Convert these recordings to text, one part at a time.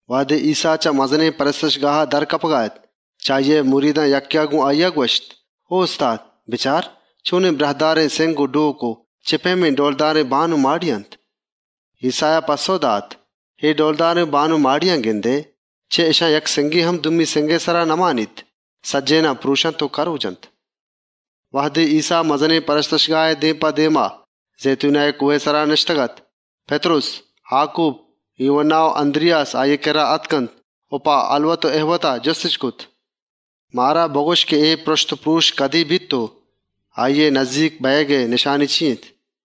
‏ وهدے ایسّا چه مزنێن پرستشگاها در آیگا اَت، چه مریدان یکّێا گۆن آییا گوَشت: «او استاد! بچار چۆنێن ٹوهێن سِنگ و ڈۆک و چِه پئیمێن ڈئولدارێن لۆگ و ماڑی اَنت.» ‏ ایسّایا پَسّئو دات: «اے ڈئولدارێن لۆگ و ماڑیانَ گندئے؟ چه اِشان یک سِنگے هم دومی سِنگئے سرا نمانیت، سجّهێنانَ پْرۆشنت و کرۆجنت.» ‏ وهدے ایسّا مزنێن پرستشگاهئے دێم په دێما زئیتونئے کۆهئے سرا نِشتگ‌اَت، پِتْرُس، آکوب، یوهَنّا و اَنْدْریاس آییئے کِرّا آتکنت و په هَلوت و اِهوتے جُستِش کرت: ‏ «مارا بگوَش، بارێن، اے پرُشت و پرۆش کدێنَ بیت و اِشیئے نزّیک بئیگئے نشانی چی اِنت؟» ‏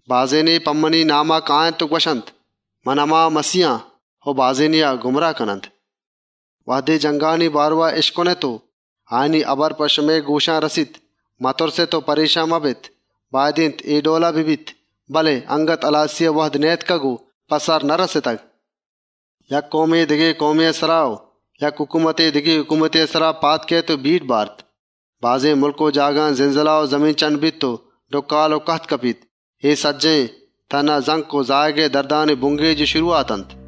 بازێنے په منی ناما کئیت و گوَشیت: ‹من هما آن› و بازێنێا گُمراهَ کنت. ‏ وهدے جنْگانی کوکّارا اِشکنێت و آیانی هال و هبر شمئے گۆشانَ کپیت، متُرسێت و پرێشان مبێت. اَلَّم اے ڈئولا بیت، بله اَنگت هلاسیئے وهد نئیاتکگ و په سر نرَستگ. ‏ یک کئومے دگه کئومێئے سرا و یک هکومتے دگه هکومتێئے سرا پادَ کئیت. بازێن مُلک و جاگهان زلزله و زمین‌چَنڈَ بیت و ڈُکّال و کَهتَ کپیت. اے، تهنا زَنک و زایگئے دردانی بُنگێج و شروهات اَنت. ‏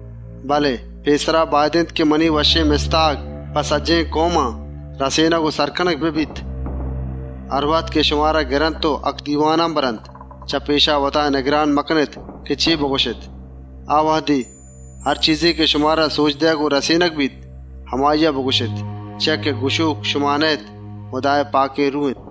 بله پێسرا باید اِنت که منی وشّێن مستاگ په سجّهێن کئومان رسێنگ و سر کنگ ببیت. ‏ هروهد که شمارا گرنت و هَکدیوانانَ برنت، چه پێشا پرێشان مبێت که: ‹ما چے بگوَشێن.› آ وهدا، هر چیزے که شمارا سۆج دئیگ و رسێنگَ بیت، هماییا بگوَشێت. چیا که گوَشۆک شما نه‌اێت، هُدائے پاکێن روه اِنت. ‏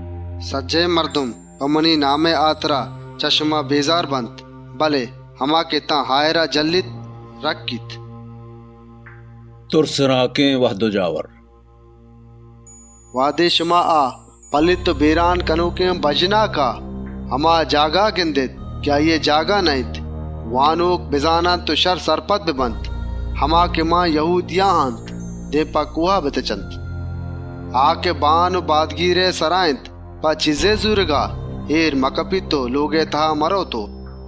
سجّهێن مردم، په منی نامئیگی چه شما نَپرتَ کننت. بله هما که تان آهِرا سکّیانَ سگّیت، آ رَکّیت. تُرسناکێن وهد و جاور ‏ «وهدے شما آ ‹پلیت و بێران کنۆکێن بَژناکا هما جاگها گندێت که آییئے جاگه نه‌اِنت،» وانۆک بزانت و شَرّ سرپد ببیت، «هما که یَهودیَها اَنت دێم په کۆهان بتچنت. ‏ آ که بان و بادگیرئے سرا اِنت په چیزێئے زورگا جَهلا اێر مکپیت و لۆگا مرئوت و ‏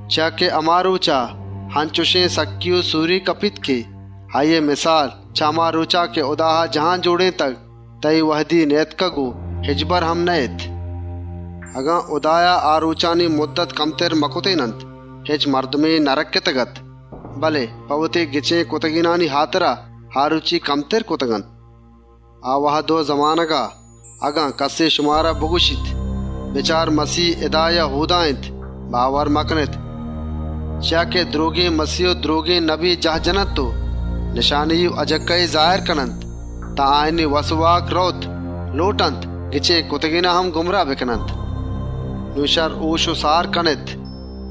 چیا که هما رۆچان، اَنچێن سکّی و سۆریے کپیت که آییئے مِسال، چه هما رۆچا که هُدایا جهان جۆڑێنتگ تان اے وهدا نئیاتکگ و هچبر هم نئیئیت. ‏ اگن هُداوندا آ سکّیانی رۆچ کَمتر مکرتێننت، هچ مردمے نرَکّتگ‌اَت. بله په وتی گچێن کرتگێنانی هاترا، آ رۆچی کَمتر کرتگ‌اَنت. ‏ آ وهدا، اگن کَسے شمارا بگوَشیت: ‹بچار، مَسیه اِدا اِنت› یا ‹بچار، اۆدا اِنت،› باور مکنێت. ‏ چیا که درۆگێن مَسیه و درۆگێن نبی جاهَ جننت و نشانی و اَجِکّایی پێشَ دارنت. وتی سجّهێن زۆرا جننت که گچێن کرتگێنان هم گُمراه بکننت. ‏ نون شَرّ هۆش و سار کنێت،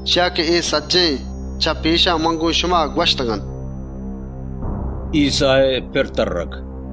چیا که اے سجّهێن جاورانی بئیگا پێسر من شمارا هال داتگ. ایسّائے پِر تَرّگ ‏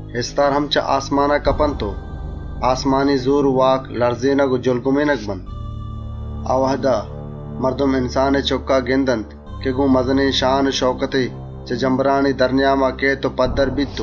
اِستار هم چه آسمانا کپنت و آسمانی زۆر و واک لَرزێنگ و جُلگُمێنگَ بنت. ‏ آ وهدا، مردم انسانئے چُکّا گندنت، که گۆن مزنێن واک و توان و شان و شئوکتے چه جمبرانی نیاما کئیت و پَدّرَ بیت. ‏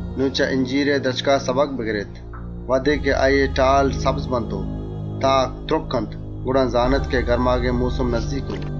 «نون چه اِنجیرئے درچکا درس و سَبک بگرێت. انچُش که آییئے ٹال نرمَ بنت و تاکَ تْرکّنت، گڑا زانێت که گرماگئے مۆسم نزّیک اِنت. ‏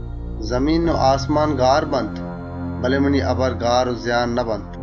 زمین و آسمان گارَ بنت، بله منی هبر هچبر گار و زیانَ نبنت. ‏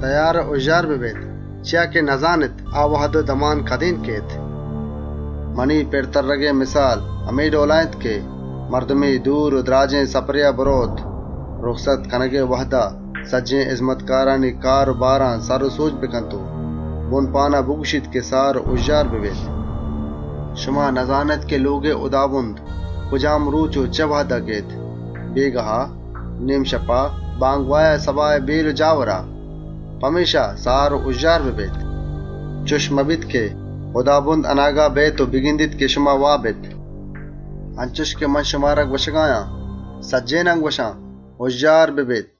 «تئیار و هُژّار بێت! چیا که نزانێت آ وهد و دمان کدێنَ کئیت. ‏ منی پِر ترّگئے مِسال، همے ڈئولا اِنت که مردے دور و دْراجێن سپرێا برئوت، رُکست کنگئے وهدا، سجّهێن هِزمتکارانی کار و باران سر و سۆج بکنت و نِگهپانا هُکم بدنت: ‹سار و هُژّار بئے!› ‏ شما نزانێت که لۆگئے هُدابُند کجام رۆچ و چِه وهدا کئیت؛ بێگاها، شپنێما، بامگواها یا سباهئے وهد و جاورا؟ پمێشکا سار و هُژّار بێت. ‏ چُش مبیت که هُدابُند اَناگت بیئیت و بگندیت که شما واب اێت. ‏ انچُش که من شمارا گوَشگا آن، سجّهێنانَ گوَشان: هُژّار بێت!»